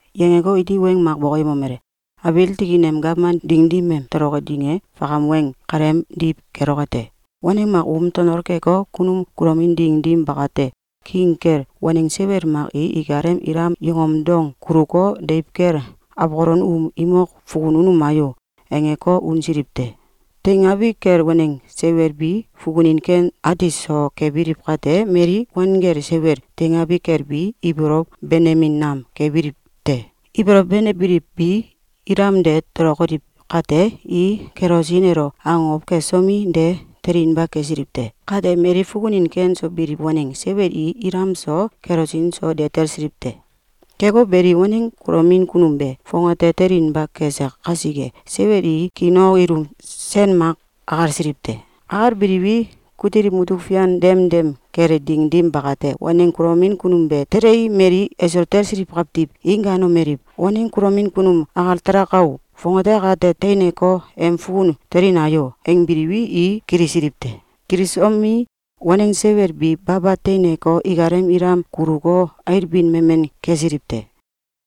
Yangeko, iti weng mak bokoyemomele: “Abiil tikin em gawman ding dim em toloke ding e fakam weng kaleemdiw keloke te. Waneng mak um tonol keko, kunum kulomin ding dim bakate, king kel waneng seiwel mak i ikalem ilam yongom dong kuluko, ‘Deiw kel awkolon um imok fukun unuma o!’, angeko, unsiliw te. Teingabi kel waneng seiwel bi fukunin ken ati so kebiliw kate, mali wanggel seiwel teingabi kel bi ibolow benemin nam kebiliw te. Ibolow benebiliw bi ilam de tolokoliw kate, i kelosin elo akokow kesomi, de telinba kesiliw te. Kate mali fukunin ken so biliw waneng seiwel i ilam so, kelosin so, de talsiliw te. Keko beli, waneng kulomin kunum be fongate telinba kese kasike, seiwel i kiinok ilum sen mak akalsiliw te. Akalbiliwi, kutil mutuk fian demdem kele ding dim bakate, waneng kulomin kunum be telei, mali eso talsiliw kawtiw i gaanomeliw: ‘Waneng kulomin kunum akal talaka o! Fongate akate teineko, em fukun telina o!’, angbiwi, i kilisiliw te. Kilisomi, waneng seiwel bi baba teineko, ikalem ilam kuluko, ailbin memen kesiliw te.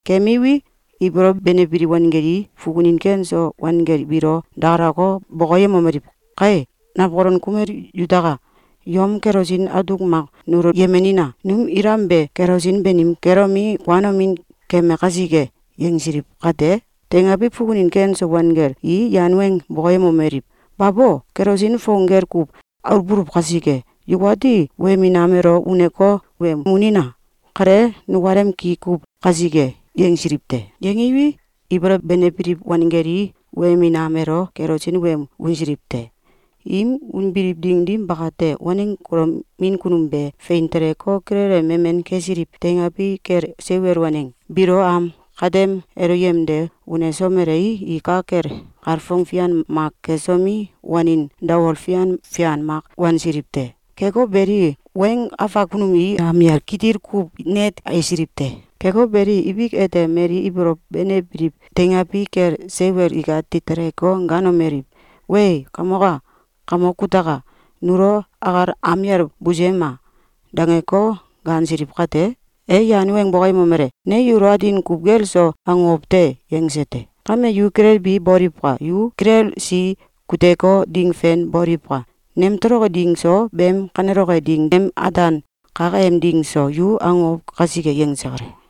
Kemiwi, ibolow benebiliw wangel i fukunin ken so wanggel biilo dakalako, bokoyemomeliw: ‘Kae, nawkolon kumel yutaka! Yom kelosin atuk mak nulo yemenina! Num ilam be kelosin banim kelomi, kuanomin keme kasike!’, yangsiliw kate, teingabi fukunin ken so wanggel i yan weng bokoyemomeliw: ‘Babo! Kelosin fong gel kuw aluwbuluw kasike, yukati wemin am elo uneko, wen unina! Kale nukalem ki kuw kasike.’, yangsiliw te. Yangiwi, ibolow benebiliw wanggel i wemin am elo kelosin wem unsiliw te. Im unbiliw ding dim bakate, waneng kulomin kunum be fein teleko, kilele memen kesiliw teingabi kel seiwel waneng biilo am kawtem elo yemde unesomelei, i ka kel kalfong fian mak kesomi, wanin dawol fian fian mak wansiliw te. Keko beli, weng afak kunum i am yal kitil kuw net ailsiliw te. Keko beli, ibik ete mali ibolow benebiliw teingabi kel seiwel ikati teleko, gaanomeliw: ‘Wee! Kamok a! Kamok kutaka! Nulo akal am yal busuyema!’, dangeko, gaansiliw kate, e yan weng bokoyemomele: ‘Ne yulo atin kuw gel so akokow te!’, yangse te. Kame yu kilelbi boliwka! Yu kilelsi kuteko, ding fen boliwka! Nem toloki ding so, beem kaneloke ding em ataan kak em ding so, yu akokow kasike!”, yangse kale.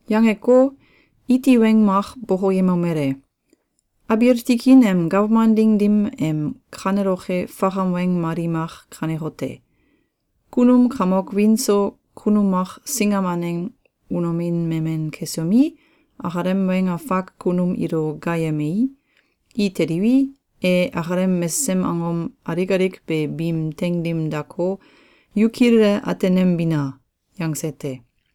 Yangeko, iti weng mak bokoyemomele: “Abiil tikin em gawman ding dim em kaneloke fakam weng mali mak kanekote: Kunum kamok wiin so kunum mak singam aneng unomin memen kesomi, akalem weng afak kunum ilo gaayemei, i teliwi, e akalem mesesem angom alik alik be biim teing dim dako, ‘Yu kilele atenembina!’, yangse te.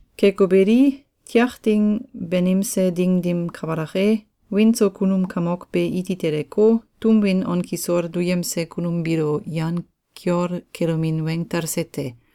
Keko beli, tiak ding banimse ding dim kabalak e, wiin so kunum kamok be iti teleko, tum win on kisol duyemse kunum biilo yan kiol kelomin weng talse te.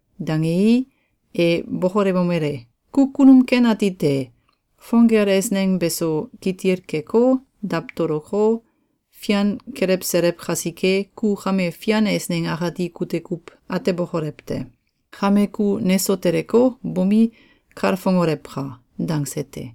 Dangei, e bokolewomele: ‘Ku kunum ken ati te! Fong gel eisneng beso kitil keko, dawtoloko, fian kelewselew kasike, ku kame fian eisneng akati kute kuw atebokolew te! Kame ku neso teleko, bomi, kalfongolewka!’, dangse te.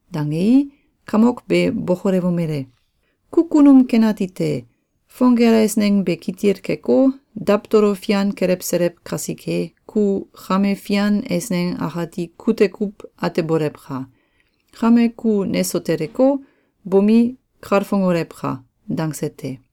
Dangei, kamok be bokolewomele: ‘Ku kunum ken ati te! Fong gel eisneng be kitil keko, dawtolo fian kelewselew kasike, ku kame fian eisneng akati kute kuw atebolewka! Kame ku neso teleko, bomi, kalfongolewka!’, dangse te.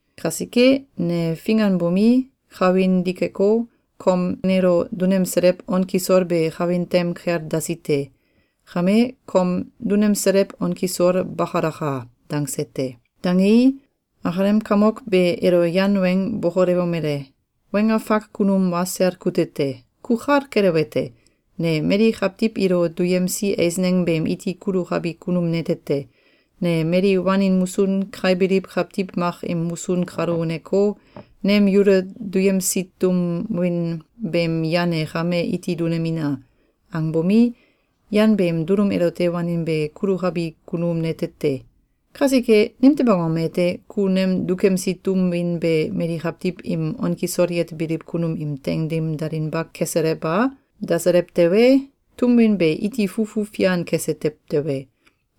Kasike, ne finganbomi, kawin dikeko, kom nelo dunemselew on kisol be kawin tem kel dasi te. Kame, kom dunemselew on kisol bakalaka!’, dangse te. Dangei, akalem kamok be elo yan weng bokolewomele: ‘Weng afak kunum wa sel kute te! Ku kal kelewete: Ne mali kawtiw ilo duyemsi eisneng beem iti kulukabi kunum nete te. Ne mali wanin musun kaibiliw kawtiw mak im musun kalo uneko, ‘Nem yulo duyemsi tum win beem yan e kame iti dunemina!’, angbomi, yan beem dulum elote wanin be kulukabi kunum nete te. Kasike, nimtew angom ete, ku nem dukemsi tum win be mali kawtiw im on kisol yetebiliw kunum im teing dim dalinba keselew a? Daselew tewe, tum win be iti fufu fian kese tew te.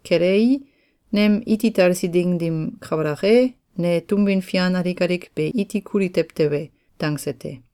Kelei, nem iti talsi ding dim kabalak e, ne tum win fian alik alik be iti kuli tew te.’, dangse te.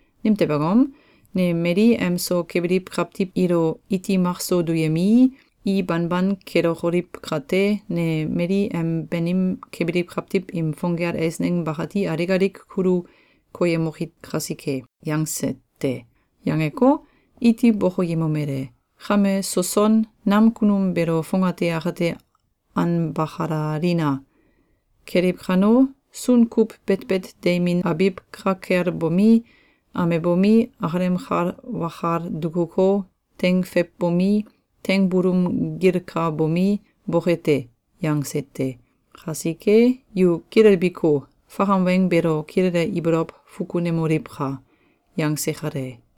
Nimtew angom? Ne mali em so kebiliw kawtiw ilo iti makso duyemii, i banban kelokoliw kate, ne mali em banim kebiliw kawtiw im fong gel eisneng bakati alik alik kulu koyemoki kasike.’, yangse te. Yangeko, iti bokoyemomele: ‘Kame soson nam kunum beelo fongate akate anbakalalina! Keliw kano, sun kuw betbet deimin abiw ka kel bomi, amebomi, akalem kal wakal dukuko, teing feiwbomi, teing bulung gilkabomi, boke te.’, yangse te. Kasike, yu kilelbiko, fakam weng beelo kilele ibolow fukunemoliwka!”, yangse kale.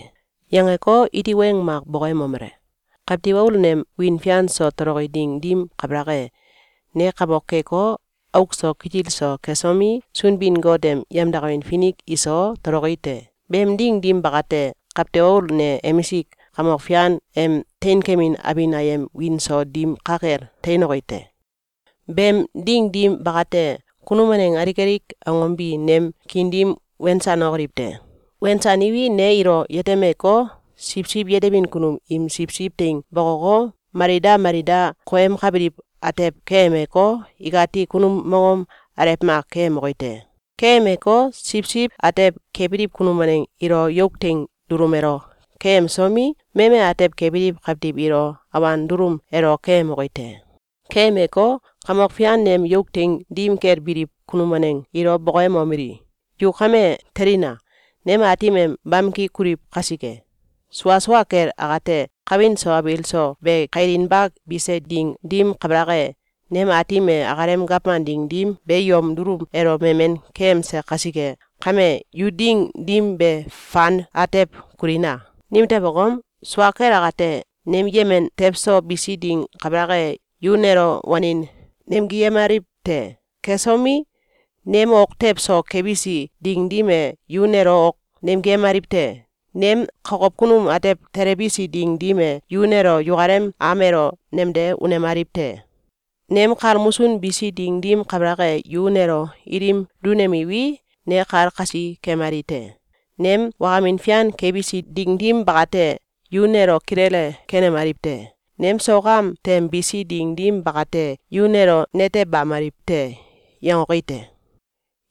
Yangeko, iti weng mak bokoyemomele: “Kawtiw Aul nem wiin fian so toloki ding dim kabalak e, ne kamok keko, auk so kitil so kesomi, Sunbin-Got em yemdakamin finik iso, toloki te. Beem ding dim bakate, Kawtiw Aul ne emisik kamok fian em teinkemin abin ayem wiin so dim ka kel teinoki te. Beem ding dim bakate, kunum waneng alik alik angom bi nem kiin dim wensanokoliw te. Wensaniwi, ne ilo yetemeko, siwsiw yetebin kunum im siwsiw teing bokoko, mali da mali da koyemkabiliw atew keyemeko, ikati kunum mongom alew mak keyemoki te. Keyemeko, siwsiw atew kebiliw kunum waneng ilo yuk teing dulum elo keyemsomi, meme atew kebiliw kawtiw ilo awan dulum elo keyemoki te. Keyemeko, kamok fian nem yuk teing dim kel biliw kunum waneng ilo bokoyemomeli: ‘Yu kame telina! Nem Aatim em bamki kuliw kasike! Sua sua kel akate, kawin so abiil so be kailinba bise ding dim kabalak e, nem Aatim e akalem gawman ding dim be yom dulum elo memen keyemse kasike kame, yu ding dim be fan atew kulina! Nimtew angom? Sua kel akate, nem yemen tew so bisi ding kabalak e, yu nelo wanin nemgiyemaliw te. Kesomi, nem ok tew so kebisi ding dim e, yu nelo ok nemgiyemaliw te. Nem kokow kunum atew telebisi ding dim e, yu nelo yukalem am elo nemde unemaliw te. Nem kal musun bisi ding dim kabalak e, yu nelo ilim dunemiwi, ne kal kasi kemali te. Nem wakamin fian kebisi ding dim bakate, yu nelo kilele kenemaliw te. Nem sok am tem bisi ding dim bakate, yu nelo netebamaliw te.’, yangoki te.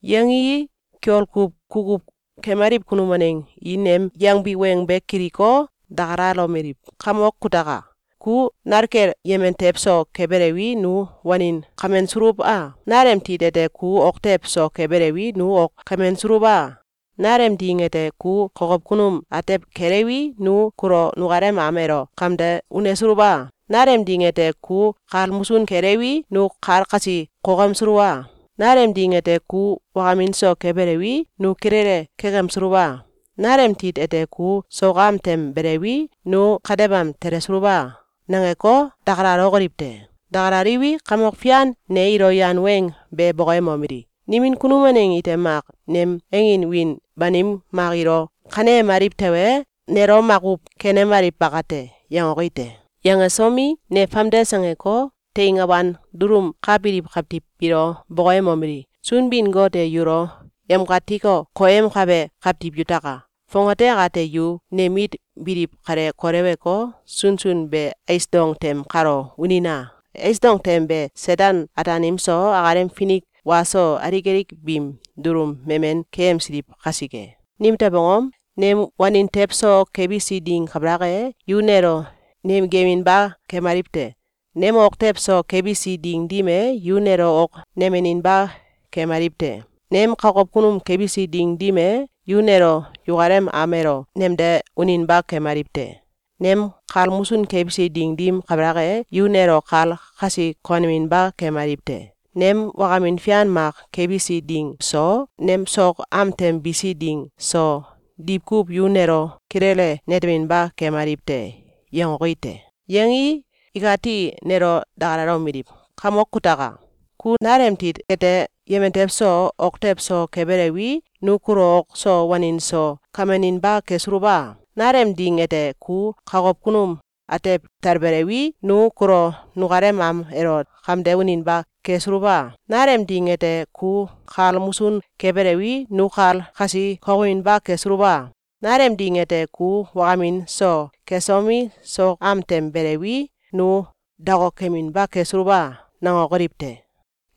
Yangii, kiol kuw kukuw kemaliw kunum waneng i nem yangbi weng be kiliko, dakalalomeliw: ‘Kamok kutaka! Ku nal kel yemen tew so kebelewi, nu wanin kamensuluw a? Nalem tit ete ku ok tew so kebelewi, nu ok kamensuluw a? Nalem ding ete ku kokow kunum atew kelewi, nu kulo nukalem am elo kamde unesuluw a? Nalem ding ete ku kal musun kelewi, nu kal kasi kokemsuluw a? Nalem ding ete, ku wakamin so kebelewi, nu kilele kekemsuluw a? Nalem tit ete ku sok am tem belewi, nu katebam telesuluw a?’, nangeko, dakalalokoliw te. Dakalaliwi, kamok fian ne ilo yan weng be bokoyemomeli: ‘Nimin kunum waneng ite mak nem angin wiin banim mak ilo kaneyemaliw tewe, nelo makuw kenemaliw bakate.’, yangoki te. Yangesomi, ne famdes angeko, teing awan dulum ka biliw kawtiw biilo bokoyemomeli: ‘Sunbin-Got e yulo yamkatiko, koyemkabe kawtiw yutaka! Fongate akate yu nem mit biliw kale koleweko, sunsun be ais dong tem kalo unina! Ais dong tem be Seten-Ataanim so, akalem finik wa so, alik alik biim dulum memen keyemsiliw kasike. Nimtew angom? Nem wanin tew so kebisi ding kabalak e, yu nelo nemgiyeminba kemaliw te. Nem ok tew so kebisi ding dim e, yu nelo ok nemeninba kemaliw te. Nem kokow kunum kebisi ding dim e, yu nelo yukalem am elo nemde uninba kemaliw te. Nem kal musun kebisi ding dim kabalak e, yu nelo kal kasi koneminba kemaliw te. Nem wakamin fian mak kebisi ding so, nem sok am tem bisi ding so, diwkuw yu nelo kilele neteminba kemaliw te.’, yangoki te. Yangii, ikati nelo dakalalomeliw: ‘Kamok kutaka! Ku nal em tit kete yemen tew so, ok tew so kebelewi, nu kulo ok so wanin so kameninba kesuluw a? Nalem ding ete, ku kokow kunum atew talbelewi, nu kulo nukalem am elo kamde uninba kesuluw a? Nalem ding ete ku kal musun kebelewi, nu kal kasi kokeminba kesuluw a? Nalem ding ete, ku wakamin so kesomi, sok am tem belewi, nu dokokeminba kesuluw a?’, nangokoliw te.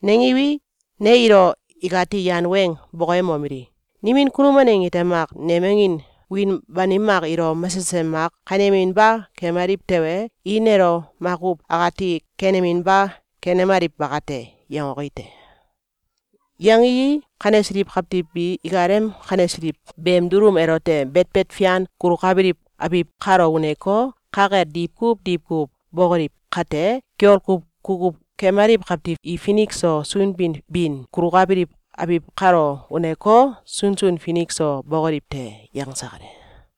Nangiwi, ne ilo ikati yan weng bokoyemomeli: ‘Nimin kunum waneng ite mak nem angin wiin banim mak ilo mesesem mak kaneyeminba kemaliw tewe, i nelo makuw akati keneminba kenemaliw bakate.’, yangoki te. Yangii, kanesiliw kawtiw bi ikalem kanesiliw beem dulum elote betbet fian kulukabiliw abiw kalo uneko, ka kel diwkuw diwkuw bokoliw kate, kiol kuw kukuw kemaliw kawtiw i finik so sunbin bin kulukabiliw abiw kalo uneko, sunsun finik so bokoliw te.”, yangse kale.